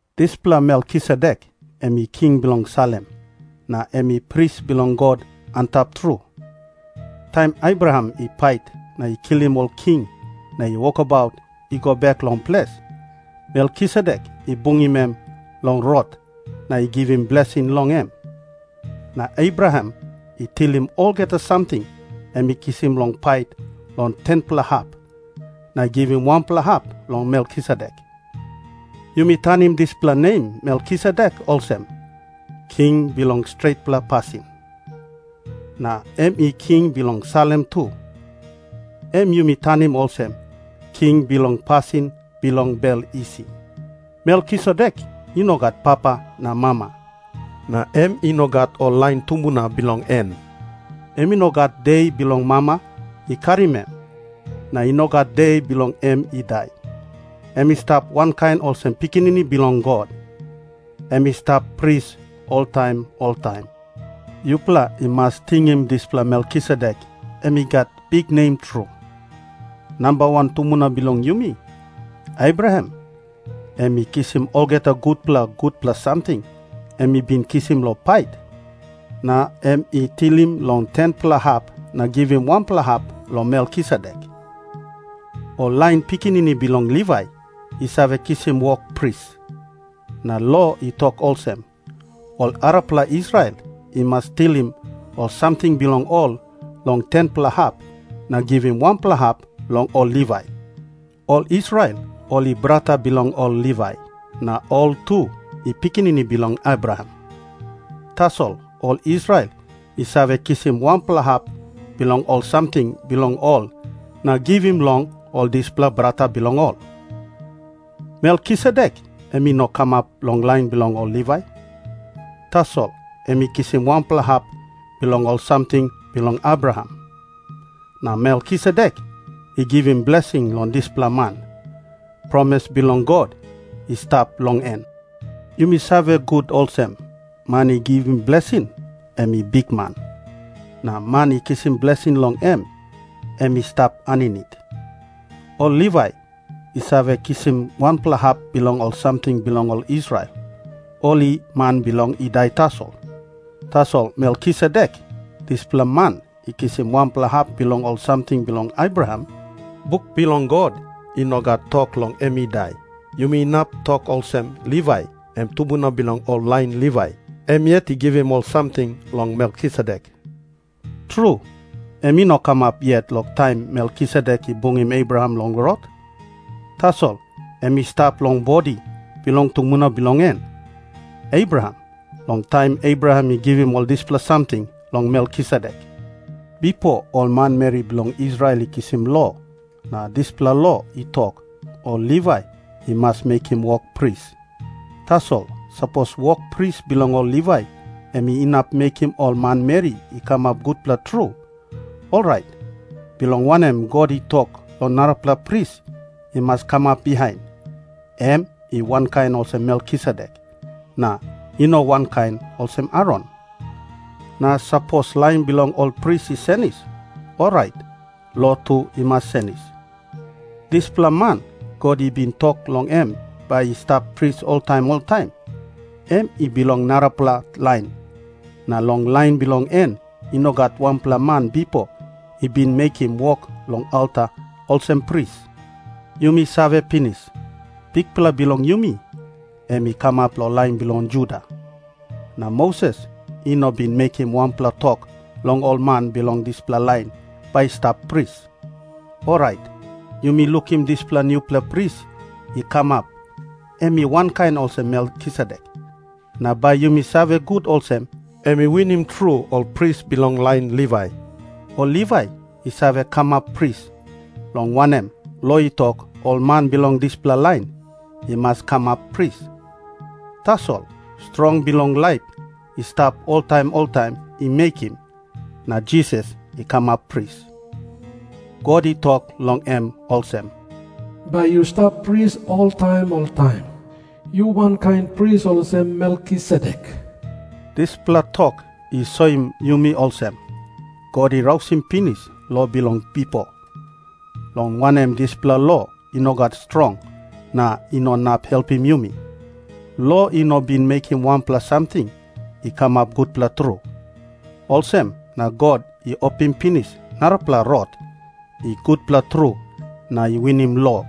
Dispela Melkisedek em i king bilong Salem, na em i pris bilong God Antap Tru. Taim Abraham i pait na i kilim ol king na i wokabaut i go bek long ples, Melkisedek i bungim em long rot na i givim blesing long em. Na Abraham i tilim olgeta samting em i kisim long pait long 10-pela hap na i givim wanpela hap long Melkisedek. Yumi tanim dispela nem Melkisedek olsem, King Bilong Stretpela Pasin. Na em i king bilong Salem tu, em yumi tanim olsem, King Bilong Pasin Bilong Bel Isi. Melkisedek i no gat papa na mama, na em i no gat ol lain tumbuna bilong en. Em i no gat de bilong mama i karim em, na i no gat de bilong em i dai. Em i stap wankain olsem Pikinini Bilong God. Em i stap pris oltaim oltaim. Yupela i mas tingim dispela Melkisedek, em i gat biknem tru. Namba wan tumbuna bilong yumi, Abraham, em i kisim olgeta gutpela gutpela samting em i bin kisim long pait, na em i tilim long 10-pela hap na givim wanpela hap long Melkisedek. Ol lain pikinini bilong Livai i save kisim wok pris. Na lo i tok olsem, ol arapela Israel i mas tilim ol samting bilong ol long 10-pela hap na givim wanpela hap long ol Livai. Ol Israel ol i brata bilong ol Livai, na ol tu i pikinini bilong Abraham. Tasol ol Israel i save kisim wanpela hap bilong ol samting bilong ol na givim long ol dispela brata bilong ol. Melkisedek em i no kamap long lain bilong ol Livai. Tasol em i kisim wanpela hap bilong ol samting bilong Abraham. Na Melkisedek i givim blesing long dispela man, promis bilong God i stap long en. Yumi save gut olsem, man i givim blesing em i bikman. Na man i kisim blesing long em, em i stap aninit. Ol Livai i save kisim wanpela hap bilong ol samting bilong ol Israel, ol i man bilong i dai tasol. Tasol Melkisedek, dispela man i kisim wanpela hap bilong ol samting bilong Abraham, buk bilong God i no gat tok long em i dai. Yumi inap tok olsem Livai, em tumbuna bilong ol lain Livai, em yet i givim ol samting long Melkisedek. Tru, em i no kamap yet long taim Melkisedek i bungim Abraham long rot, tasol em i stap long bodi bilong tumbuna bilong en, Abraham, long taim Abraham i givim ol dispela samting long Melkisedek. Bipo ol manmeri bilong Israel i kisim lo, na dispela lo i tok, ol Livai i mas mekim wok pris. Tasol sapos wok pris bilong ol Livai em inap mekim ol manmeri i kamap gutpela tru, orait bilong wanem God i tok long narapela pris i mas kamap bihain, em i wankain olsem Melkisedek, na i no wankain olsem Aron? Na sapos lain bilong ol pris i senis, orait lo tu i mas senis. Dispela man God i bin tok long em bai i stap pris oltaim oltaim, em i bilong narapela lain, na long lain bilong en i no gat wanpela man bipo i bin mekim wok long alta olsem pris. Yumi save pinis, Bikpela bilong yumi em i kamap long lain bilong Juda. Na Moses i no bin mekim wanpela tok long ol man bilong dispela lain bai i stap pris. Orait yumi lukim dispela nupela pris i kamap em i wankain olsem Melkisedek, na bai yumi save gut olsem, em i winim tru ol pris bilong lain Livai. Ol Livai i save kamap pris, long wanem, lo i tok, ol man bilong dispela lain i mas kamap pris. Tasol strong bilong laip i stap oltaim oltaim i mekim, na Jisas i kamap pris. God i tok long em olsem, “Bai yu stap pris oltaim oltaim. Yu wankain pris olsem Melkisedek.” Dispela tok i soim yumi olsem, God i rausim pinis lo bilong bipo, long wanem dispela lo i no gat strong na i no inap helpim yumi. Lo i no bin mekim wanpela samting i kamap gutpela tru. Olsem na God i opim pinis narapela rot i gutpela tru na i winim lo,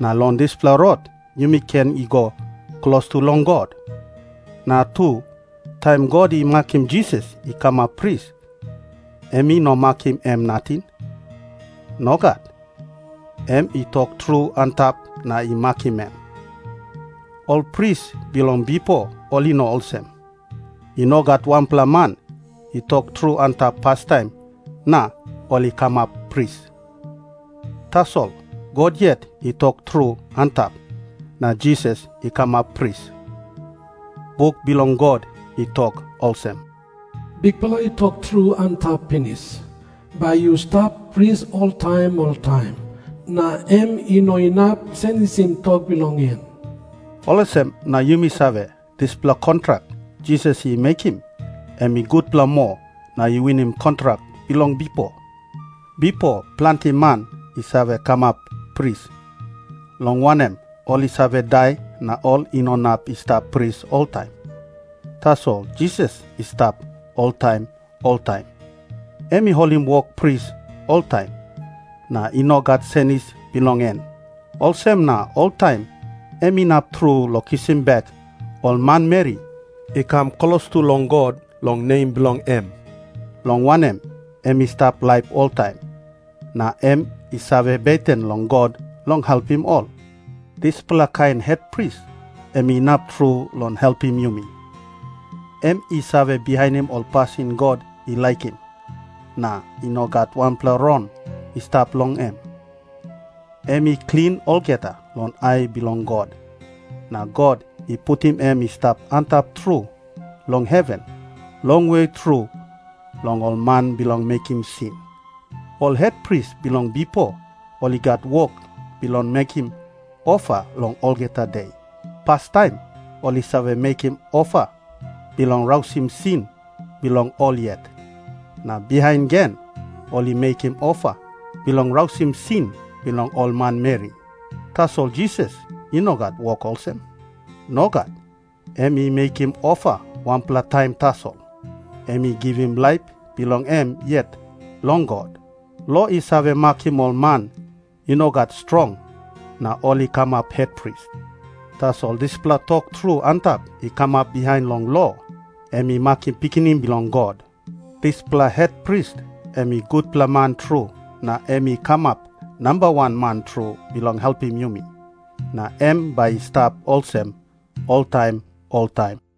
na long dispela rot yumi ken i go klostu long God. Na tu, taim God i makim Jisas i kamap pris, em i no makim em nating. Nogat. Em i tok tru antap na i makim em. Ol pris bilong bipo ol i no olsem. I no gat wanpela man i tok tru antap pastaim na ol i kamap pris. Tasol God yet i tok tru antap, na Jisas i kamap pris. Buk bilong God i tok olsem, “Bikpela i tok tru antap pinis, ‘Bai yu stap pris oltaim oltaim,’ na em i no inap senisim tok bilong en.” Olsem na yumi save, dispela kontrak Jisas i mekim, em i gutpela moa na i winim kontrak bilong bipo. Bipo planti man i save kamap pris, long wanem, ol i save dai na ol i no inap i stap pris oltaim. Tasol Jisas i stap oltaim oltaim. Em i holim wok pris oltaim, na i no gat senis bilong en. Olsem na oltaim em inap tru long kisim bek ol manmeri i kam klostu long God long nem bilong em, long wanem, em i stap laip oltaim, na em i save beten long God long helpim ol. Dispela kain hetpris em inap tru long helpim yumi. Em i save bihainim ol pasin God i laikim, na i no gat wanpela rong i stap long em. Em i klin olgeta long ai bilong God. Na God i putim em i stap antap tru long heven, longwe tru long ol man bilong mekim sin. Ol hetpris bilong bipo ol i gat wok bilong mekim ofa long olgeta de. Pastaim ol i save mekim ofa bilong rausim sin bilong ol yet. Na bihain gen ol i mekim ofa bilong rausim sin bilong ol manmeri. Tasol Jisas i no gat wok olsem. Nogat. Em i mekim ofa wanpela taim tasol. Em i givim laip bilong em yet long God. Lo i save makim ol man i no gat strong, na ol i kamap hetpris. Tasol dispela tok tru antap i kamap bihain long lo, em i makim Pikinini Bilong God. Dispela hetpris em i gutpela man tru na em i kamap nambawan man tru bilong helpim yumi. Na em bai i stap olsem oltaim oltaim.